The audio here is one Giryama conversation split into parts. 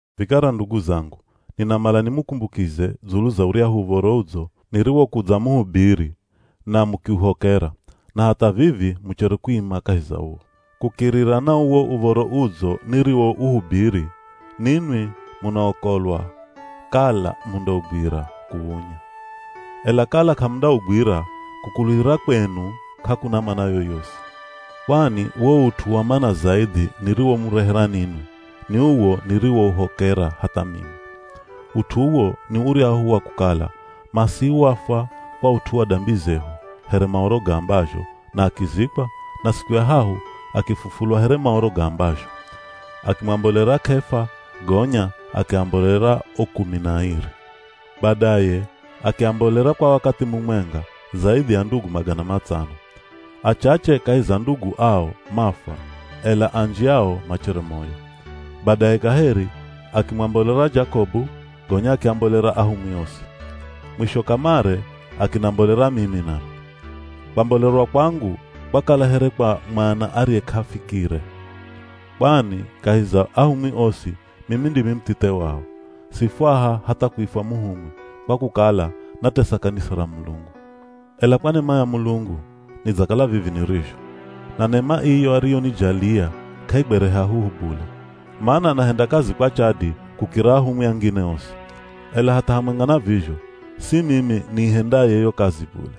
Vikara ndugu zangu, ninamala nimukumbukize dzulu za uryahu Uv̱oro Udzo niriwokudzamuhubiri, na mukiuhokera, na hatha vivi muchere kuima kahi za uwo. Kukirira na uwo Uv̱oro Udzo niriwouhubiri, ninwi munaokolwa kala mundaugwira kuwunya, ela kala k'amundaugwira, kukuluhira kwenu k'akuna mana yoyosi. Kwani wo ut'u wa mana zaidhi niriwomurehera ninwi, ni uwo niriwouhokera hatha mimi. Ut'u uwo ni uryahu wa kukala Masihi wafwa kwa ut'u wa dambi zehu here Maoro gaambazho, na akizikwa, na siku ya hahu akifufulwa here Maoro gaambazho. Akimwambolera K'efa, gonya akiambolera o kumi na airi. Badaye akiambolera kwa wakathi mumwenga, zaidhi ya ndugu magana matsano. Achache kahi za ndugu ao mafwa ela anji ao machere moyo. Badaye kaheri akimwambolera Jakobu, gonya akiambolera ahumwi osi. Mwisho kamare akinambolera mimi nami. Kwambolerwa kwangu kwakala here kwa mwana ariye k'afikire. Kwani kahi za ahumwi osi mimi ndimi muthithe wao. Sifwaha hatha kuifwa muhumwi kwa kukala natesa kanisa ra Mulungu. Ela kwa nema ya Mulungu, nidzakala vivi nirizho. Na nema iyo ariyonijalia k'aigwere hahuhu bule, mana nahenda kazi kwa chadi kukira ahumwi angine osi. Ela hatha hamwenga na vizho, si mimi niihendaye yo kazi bule,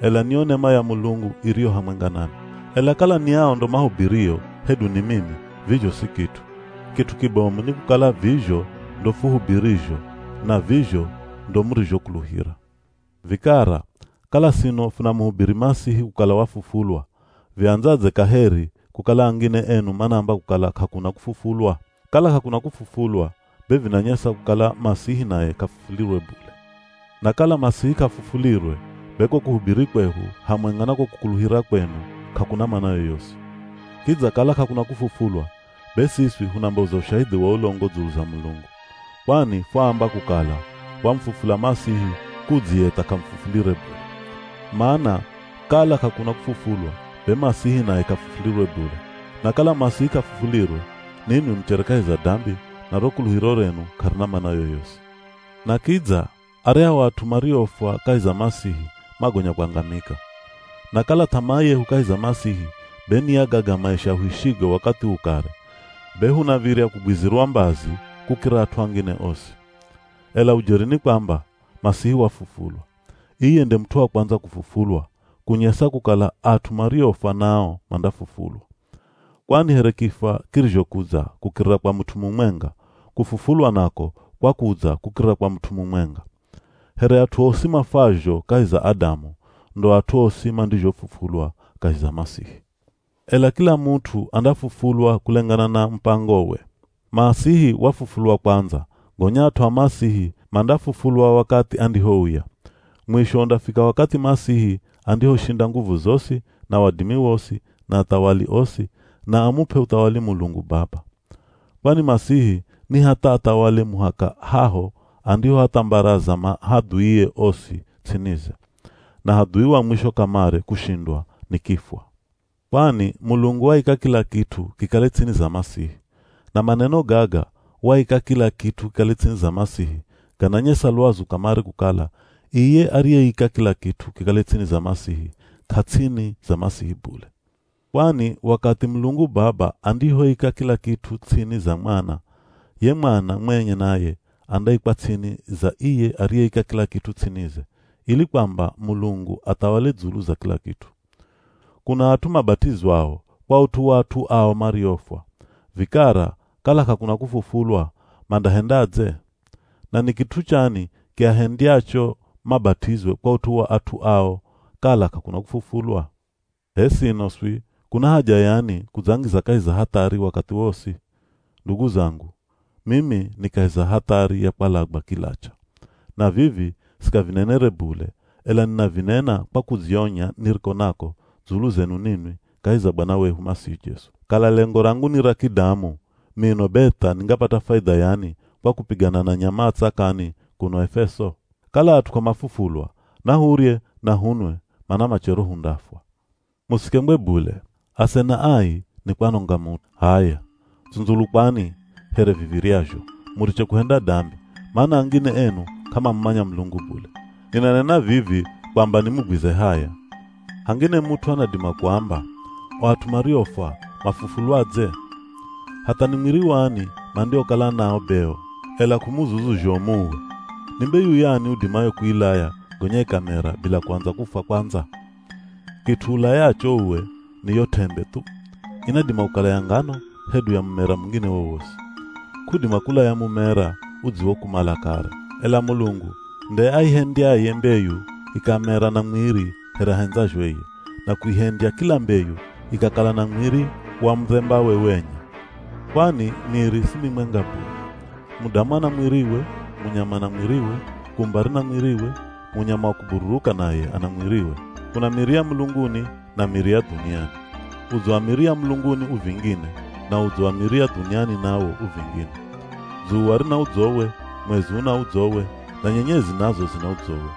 ela ni yo nema ya Mulungu iriyo hamwenga nami. Ela kala ni ao ndo mahubirio, hedu ni mimi, vizho si kit'u. Kit'u kibomu ni kukala vizho ndo fuhubirizho, na vizho ndo murizhokuluhira. Vikara, kala sino funamuhubiri Masihi kukala wafufulwa, viandzadze kaheri kukala angine enu manaamba kukala k'akuna kufufulwa? Kala k'akuna kufufulwa, be vinanyesa kukala Masihi naye k'afufulirwe bule. Na kala Masihi k'afufulirwe, be ko kuhubiri kwehu, hamwenga na ko kukuluhira kwenu k'akuna mana yoyosi. Kidza kala k'akuna kufufulwa, be siswi hunamboza ushahidhi wa ulongo dzulu za Mulungu. Kwani fwaamba kukala wamufufula Masihi kudzi ye tha k'amufufulire bule. Mana kala k'akuna kufufulwa be Masihi naye k'afufulirwe bule. Na kala Masihi k'afufulirwe, ninwi muchere kahi za dambi, na ro kuluhiro renu k'arina mana yoyosi. Na kidza aryahu at'u mariofwa kahi za Masihi magonya kwangamika. Na kala th'amaa yehu kahi za Masihi be ni ya gaga maisha huishigo wakathi uu kare, be hunav̱irya kugwizirwa mbazi kukira at'u angine osi. Ela ujeri ni kwamba, Masihi wafufulwa. Iye nde mut'u wa kwandza kufufulwa, kunyesa kukala at'u mariofwa nao mandafufulwa. Kwani here kifwa kirizhokudza kukirira kwa mut'u mumwenga, kufufulwa nako kwakudza kukirira kwa mut'u mumwenga. Here at'u osi mafwazho kahi za Adamu, ndo at'u osi mandizhofufulwa kahi za Masihi. Ela kila mut'u andafufulwa kulengana na mupangowe. Masihi wafufulwa kwandza, gonya at'u a Masihi mandafufulwa wakathi andihouya. Mwisho undafika wakathi Masihi andihoshinda nguvu zosi, na wadimi wosi, na athawali osi, na amup'e uthawali Mulungu Baba. Kwani Masihi ni hatha athawale muhaka haho andihoathambaraza mahadhuie osi ts'inize. Na hadhui wa mwisho kamare kushindwa ni kifwa. Kwani “Mulungu waika kila kit'u kikale ts'ini za Masihi.” Na maneno gaga “Waika kila kit'u kikale ts'ini za Masihi,” gananyesa lwazu kamare kukala, iye ariyeika kila kit'u kikale ts'ini za Masihi k'ats'ini za Masihi bule. Kwani wakathi Mulungu Baba andihoika kila kit'u ts'ini za mwana, ye mwana mwenye naye andaikwa ts'ini za iye ariyeika kila kit'u ts'inize, ili kwamba Mulungu athawale dzulu za kila kit'u. Kuna at'u mabat'izwao kwa ut'u wa at'u ao mariofwa. Vikara kala k'akuna kufufulwa, mandahendadze? Na ni kit'u chani kiahendyacho mabat'izwe kwa ut'u wa at'u ao kala k'akuna kufufulwa? H'e sino swi, kuna haja yani kudzangiza kahi za hathari wakathi wosi? Ndugu zangu, mimi ni kahi za hathari ya kwalagwa kilacha. Na vivi sikavinenere bule ela ninavinena kwa kudzionya niriko nako dzulu zenu ninwi kahi za Bwana wehu Masihi Jesu. Kala lengo rangu ni ra kidamu, mino be tha ningapata faidha yani kwa kupigana na nyama a tsakani kuno Efeso? Kala at'u k'amafufulwa, “Nahurye, na hunwe mana machero hundafwa.” Musikengwe bule, “Asena ai, nikwanonga mut'u.” H'aya, tsundzulukwani here viv̱iryazho, muriche kuhenda dambi, mana angine enu k'amamumanya Mulungu bule. Ninanena vivi kwamba nimugwize haya. Hangine mut'u anadima kuamba, “O at'u mariofwa mafufulwadze? Hatha ni mwiri wani mandiokala nao be o?” Ela k'umuzuzu zhomu uwe! Ni mbeyu yani udimayo kuilaya gonya ikamera bila kuandza kufwa kwandza? Kit'u ulayacho uwe ni yo t'embe thu. Inadima kukala ya ngano hedu ya mumera mungine wowosi. K'udima kulaya mumera udziwokumala kare. Ela Mulungu nde aihendyaye mbeyu ikamera na mwiri here ahendzazho iye, na kuihendya kila mbeyu ikakala na mwiri wa mudhembawe wenye. Kwani miri si mimwenga bule. Mudamu ana mwiriwe, munyama ana mwiriwe, kumba rina mwiriwe, munyama wa kubururuka naye ana mwiriwe. Kuna miri ya mulunguni, na miri ya dhuniani. Udzo wa miri ya mulunguni u vingine, na udzo wa miri ya dhuniani nawo u vingine. Dzuwa rina udzowe, mwezi una udzowe, na nyenyezi nazo zina udzowe.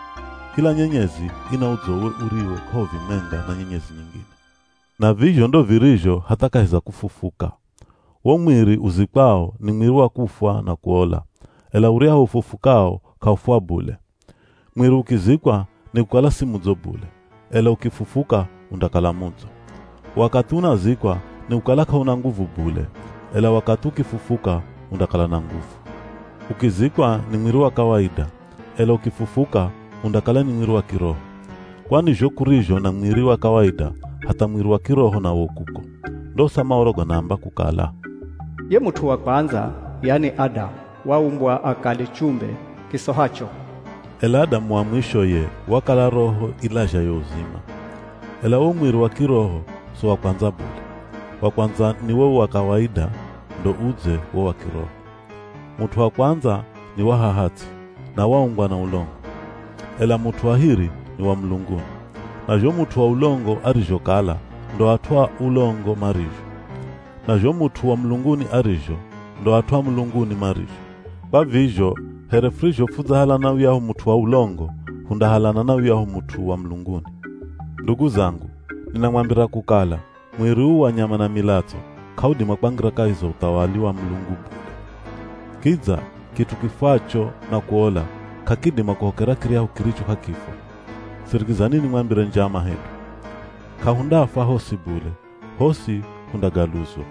Kila nyenyezi ina udzowe uriwo k'auvimwenga na nyenyezi nyingine. Na vizho ndo virizho hatha kahi za kufufuka. Wo mwiri uzikwao ni mwiri wa kufwa na kuola, ela uryahu ufufukao k'aufwa bule. Mwiri ukizikwa ni kukala si mudzo bule, ela ukifufuka undakala mudzo. Wakathi unazikwa nikukala k'auna nguvu bule, ela wakathi ukifufuka undakala na nguvu. Ukizikwa ni mwiri wa kawaida, ela ukifufuka undakala ni mwiri wa kiroho. Kwani zho kurizho na mwiri wa kawaida, hatha mwiri wa kiroho nawo u kuko. Ndosa Maoro ganaamba kukala “Ye mut'u wa kwandza, yani Adamu, waumbwa akale chumbe kisohacho.” Ela Adamu wa mwisho ye wakala roho ilazhayo uzima. Ela wo mwiri wa kiroho so wa kwandza bule. Wa kwandza ni wo wa kawaida ndo udze wo wa kiroho. Mut'u wa kwandza ni wa haha ts'i, na waumbwa na ulongo. Ela mut'u wa hiri ni wa mulunguni. Na zho mut'u wa ulongo arizhokala ndo at'u a ulongo marizho. Na zho mut'u wa mulunguni arizho, ndo at'u a mulunguni marizho. Kwa vizho, here furizho fudzahalana na yuyahu mut'u wa ulongo, hundahalana na yuyahu mut'u wa mulunguni. Ndugu zangu, ninamwambira kukala, mwiri uu wa nyama na milatso, k'audima kwangira kahi za uthawali wa Mulungu bule. Kidza kit'u kifwacho na kuola, k'akidima kuhokera kiryahu kiricho k'akifwa. Sirikizani nimwambire njama hedu, k'ahundafwa hosi bule, hosi hundagaluzwa.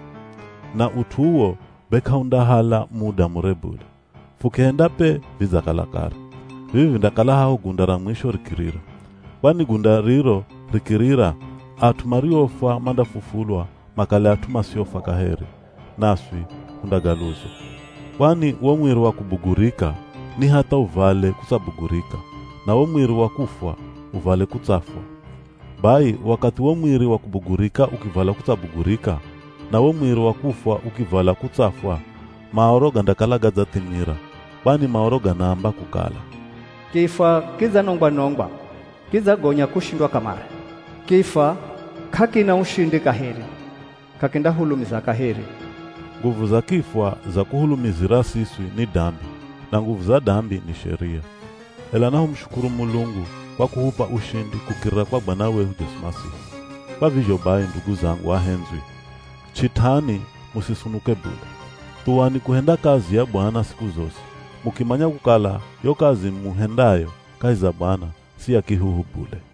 Na ut'u uwo be k'aundahala muda mure bule. Fukihenda pe vidzakala kare. Vivi vindakala haho gunda ra mwisho rikirira. Kwani gunda riro rikirira, at'u mariofwa mandafufulwa makale at'u masiofwa kaheri, naswi hundagaluzwa. Kwani wo mwiri wa kubugurika ni hatha uvale kutsabugurika, na wo mwiri wa kufwa uvale kutsafwa. Bai, wakathi wo mwiri wa kubugurika ukivala kutsabugurika, na wo mwiri wa kufwa ukivala kutsafwa, Maoro gandakala gadzathimira. Kwani Maoro ganaamba kukala, “Kifwa kidzanongwa-nongwa, kidzagonya kushindwa kamare.” “Kifwa k'akina ushindi kaheri, k'akindahulumiza kaheri.” Nguvu za kifwa za kuhulumizira siswi ni dambi, na nguvu za dambi ni sheria. Ela nahumushukuru Mulungu kwa kuhup'a ushindi kukirira kwa Bwana wehu Jesu Masihi. Kwa vizho bai ndugu zangu ahendzwi, ch'it'ani musisunuke bule. Thuwani kuhenda kazi ya Bwana siku zosi, mukimanya kukala yo kazi muhendayo kahi za Bwana si ya kihuhu bule.